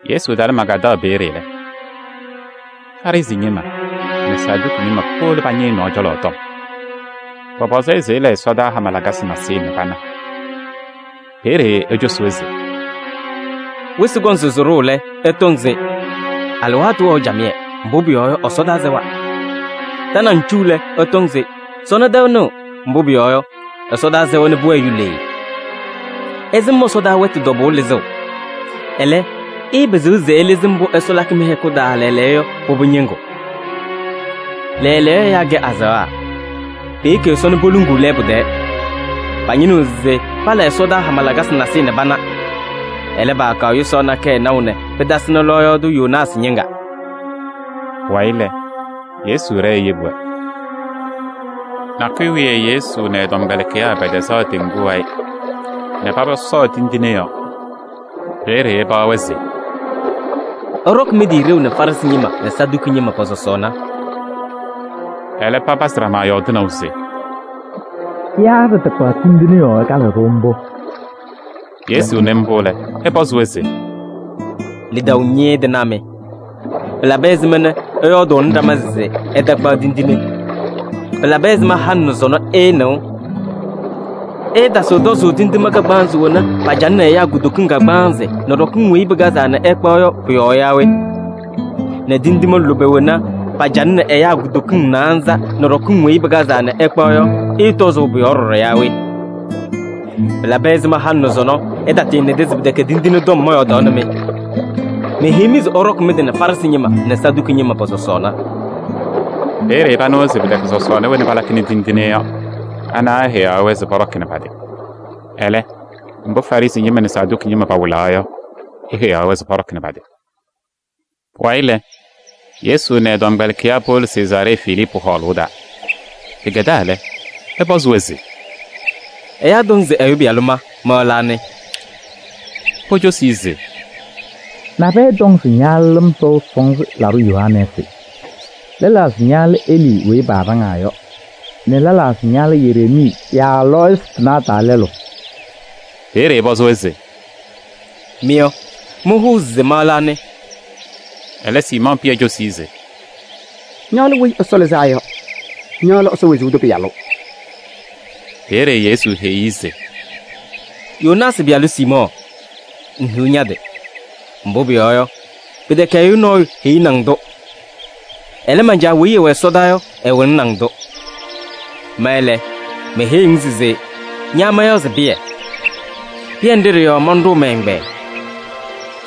Yesu talɩ Magaadaɣ peeye lɛ, Farɩsɩ ñɩma nɛ Saduki ñɩma powolo pañɩ ɛ-nɔɔ cɔlɔ tɔm. Pɔpɔzɩ-ɩ se ɛla ɛsɔdaa hama lakasɩ nasɩyɩ nɛ pana. Peeye ecosi-wɛ se: [“Wɩsɩ kɔŋ se sɩɖʋʋ lɛ, ɩtɔŋ se: ‘Alɩwaatʋ wɛɣ camɩyɛ, mbʋ pʋyɔɔ yɔ, ɛsɔdaa sɛwa.’ Tanaŋ cu lɛ, ɩtɔŋ se: ‘Sɔnɔ tɛʋ nɩɣ, mbʋ pʋyɔɔ yɔ, ɛsɔdaa sɛwa nɛ pʋwɛɛ yulee.’ Ɩsɩm ɛsɔdaa wɛtʋ tɔbʋʋ lɩzʋʋ, ɛlɛ, ɩɩpɩzɩɣ se ɩlɩzɩ mbʋ Ɛsɔ lakɩ mɩ-hɛkʋ taa lɛɛlɛɛyɔ yɔ pʋbʋ ñɩŋgʋ.] Lɛɛlɛɛyɔ ɛyaa kɛ azaɣa, peyeki Ɛsɔ nɛ poluŋuu lɛɛbʋ tɛɛ. Pañɩnɩɣ se pala ɛsɔdaa hama lakasɩ nasɩyɩ nɛ pana. Ɛlɛ, paakaɣ yʋsaɣ nakɛyɛ naʋ nɛ pɩtasɩnɩ lɔɔyaɣ tʋ Yoonaasɩ ñɩŋga.” Pʋwayɩ lɛ, Yesu ɖɛɛ eyebi-wɛ. Nakʋyʋ wiye Yesu nɛ ɛ-tɔmkpɛlɩkɩyaa pɛtɛzaɣ teŋgu wayɩ nɛ paba sɔɔ tindine yɔɔ. Peeye ɛpaɣ-wɛ se: “Ɩɖɔkɩ mɩ-tɩ ɖeu nɛ Farɩsɩ ñɩma nɛ Saduki ñɩma pɔ-sɔsɔɔna.” Ɛlɛ papazɩ ɖama yɔɔdɩnaʋ se: “Yaa ɖɩtakpaɣ tindine yɔɔ ɛkalɩɣ-ɖʋ mbʋ?” Yesu nɩ mbʋ lɛ, ɛpɔzɩ-wɛ se: “Lidaʋ ñɩɩɩ tɩnaa mɩ! Pɩlabɩ ɛzɩma nɛ ɩyɔɔdʋʋnɩ ɖama se ɩtakpaɣ tindine? Pɩlabɩ ɛzɩma halɩ nɛ sɔnɔ ɩɩnɩɣ? Ɩɩtasɩɣ tɔzʋʋ tindine kagbaanzɩ wena pacalɩnɩ ɛyaa kutokiŋ kagbaanzɩ nɛ ɖɔkɩŋ weyi pɩkazaa nɛ ɩkpaɣ yɔ pʋ-yɔɔ yaa we? Nɛ tindine lʋbɛ wena nɛ pacalɩnɩ ɛyaa kutokiŋ naanza nɛ ɖɔkɩŋ weyi pɩkazaa nɛ ɩkpaɣ yɔ, ɩɩtɔzʋʋ pʋ-yɔɔ ɖɔɖɔ yaa we? Pɩlabɩ ɛzɩma halɩ nɛ sɔnɔ ɩtatɩɩnɩda se pɩtɛkɛ tindine tɔm mɔyɔɔdaɣnɩ-mɩ? Meheyi-mɩ se ɩɖɔkɩ mɩ-tɩ nɛ Farɩsɩ ñɩma nɛ Saduki ñɩma pɔ-sɔsɔɔna.” Peeye panɩwa se pɩtɛkɛ sɔsɔɔna wena palakɩnɩ tindine yɔ, ana eheyaɣ-wɛ se pɔɖɔkɩ nɛ pa-tɩ. Ɛlɛ, mbʋ Farɩsɩ ñɩma nɛ Saduki ñɩma pawɩlaɣ yɔ, eheyaɣ-wɛ se pɔɖɔkɩ nɛ pa-tɩ. Pʋwayɩ lɛ, Yesu nɛ ɛ-tɔmkpɛlɩkɩyaa powolo Sezaaree Filiipu hɔɔlʋʋ taa. Pɩkɛdaa lɛ, ɛpɔzɩ-wɛ se: “Ɛyaa tɔŋ se Ɛyʋ Pɩyalʋ ma, ma lɛ anɩ?” Pocosi-i se: “Nabɛyɛ tɔŋ se ña lɛ Lɩm Sɔʋ Sɔnzɩ Laɖʋ Yohanɛɛsɩ. Lɛlaa se ña lɛ Elii weyi paaɖaŋaa yɔ nɛ lɛlaa se ña lɛ Yereemii yaa lɔɔyɩsɩ tɩnaa taa lɛlʋ.” Peeye ɛpɔzɩ-wɛ se: “Mɩ yɔ, mɩhʋʋ se ma lɛ anɩ?” Ɛlɛ, Siimɔɔ Pɩyɛ cosi-i se: “Ña lɛ Weyi Ɛsɔ Lɩzaa Yɔ. Ña lɛ Ɛsɔ wezuu tʋ Pɩyalʋ.” Peeye Yesu heyi-i se: “Yoonaasɩ pɩyalʋ Siimɔɔ! Ŋhiɣ ña-tɩ! Mbʋ pʋyɔɔ yɔ, pɩtɛkɛ ɛyʋ nɔɔyʋ heyini-ŋ-tʋ. Ɛlɛ, man-Caa weyi ɛwɛ ɛsɔdaa yɔ, ɛwɩlɩnɩ-ŋ-tʋ. Ma lɛ, meheyiɣ-ŋ se: ña mayaɣ se Pɩyɛ. Pɩyɛ ndɩ ɖɩ-yɔɔ manɖʋʋ mɛ-ɛgbɛyɛ.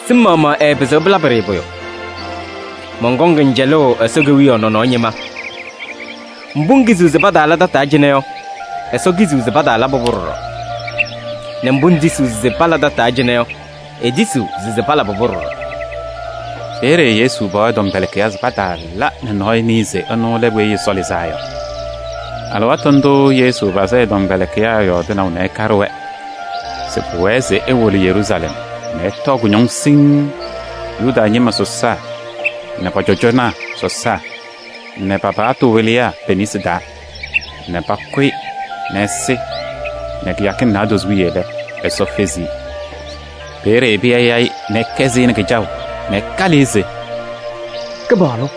Sɩm maɣmaɣ ɛɛpɩzɩɣ pɩlabɩ-ɖɩ pʋyʋ. Mɔnkɔŋ-ŋ cɛlʋʋ Ɛsɔ Kewiyaɣ nɔnɔɔ ñɩma: mbʋ ŋkiziɣ se pataala tataa cɩnɛ yɔ, Ɛsɔ kiziɣ se pataalabɩ-pʋ ɖɔɖɔ, nɛ mbʋ ŋtisiɣ se pala tataa cɩnɛ yɔ, etisiɣ se palabɩ-pʋ ɖɔɖɔ.” Peeye Yesu paɣ ɛ-tɔmkpɛlɩkɩyaa se pataala nɛ nɔɔyʋ nɩɩ se ɛnʋ lɛ Weyi Ɛsɔ Lɩzaa Yɔ. Alɩwaatʋ ndʋʋ Yesu pazɩ ɛ-tɔmkpɛlɩkɩyaa yɔɔdɩnaʋ nɛ ɛkaɖɩ-wɛ se pʋwɛɛ se ewolo Yeruusalɛm nɛ ɛtɔɔ kʋñɔŋ siŋŋ Yuda ñɩma sɔsaa nɛ pɔ-cɔjɔnaa sɔsaa nɛ pa-paɣtʋ wɩlɩyaa pe-nesi taa nɛ pakʋ-ɩ nɛ ɛsɩ nɛ kɩyakɩŋ naadozo wiye lɛ, Ɛsɔ fezi-i. Peeye Pɩyɛ ya-ɩ nɛ ɛkɛsɩ-ɩ kɩjaʋ nɛ ɛkalɩ-ɩ se: “Kɩpaɣlʋ!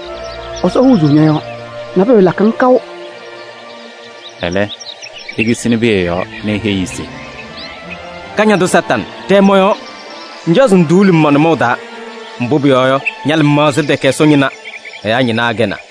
Ɛsɔ huuzuu ñɔ-yɔɔ. Nabʋyʋ ɛɛlakɩ-ŋ kaʋ!” Ɛlɛ, ekisini Pɩyɛ yɔɔ nɛ eheyi-i se: “Kañadʋ Satanɩ, ɖɛɛ mɔ-yɔɔ! Ŋcaɣ se ŋduuli-m ma-nʋmɔʋ taa. Mbʋ pʋyɔɔ yɔ, ña-lɩmaɣza tɛkɛ Ɛsɔ ñɩna, ɛyaa ñɩna akɛnaa.”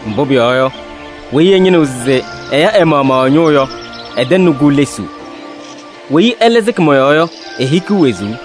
Mbʋ pʋyɔɔ yɔ, weyi ɛñɩnɩɣ se ɛya ɛ-maɣmaɣ ɛ-ñʋʋ yɔ, ɛtɛŋnɩ-kʋ lesuu. Weyi ɛlɛ sɩkɩ mɔ-yɔɔ yɔ, ehikiɣ wezuu.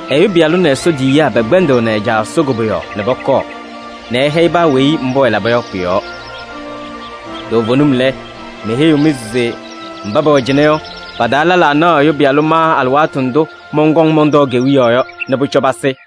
Ɛyʋ Pɩyalʋ nɛ Ɛsɔ tiyiyaa pɛkpɛndɩɣnɩ ɛ-Caa Ɛsɔ koboyaɣ nɛ pɔkɔɔ nɛ ɛhɛyɩ paa weyi mbʋ ɛlaba yɔ pʋ-yɔɔ. Toovenim lɛ, meheyiɣ-mɩ se: mba pɛwɛ cɩnɛ yɔ, pa-taa lɛlaa naɣ Ɛyʋ Pɩyalʋ ma alɩwaatʋ ndʋ mɔnkɔŋ mɔntɔɔ kewiyaɣ yɔ nɛ pʋcɔ pasɩ.”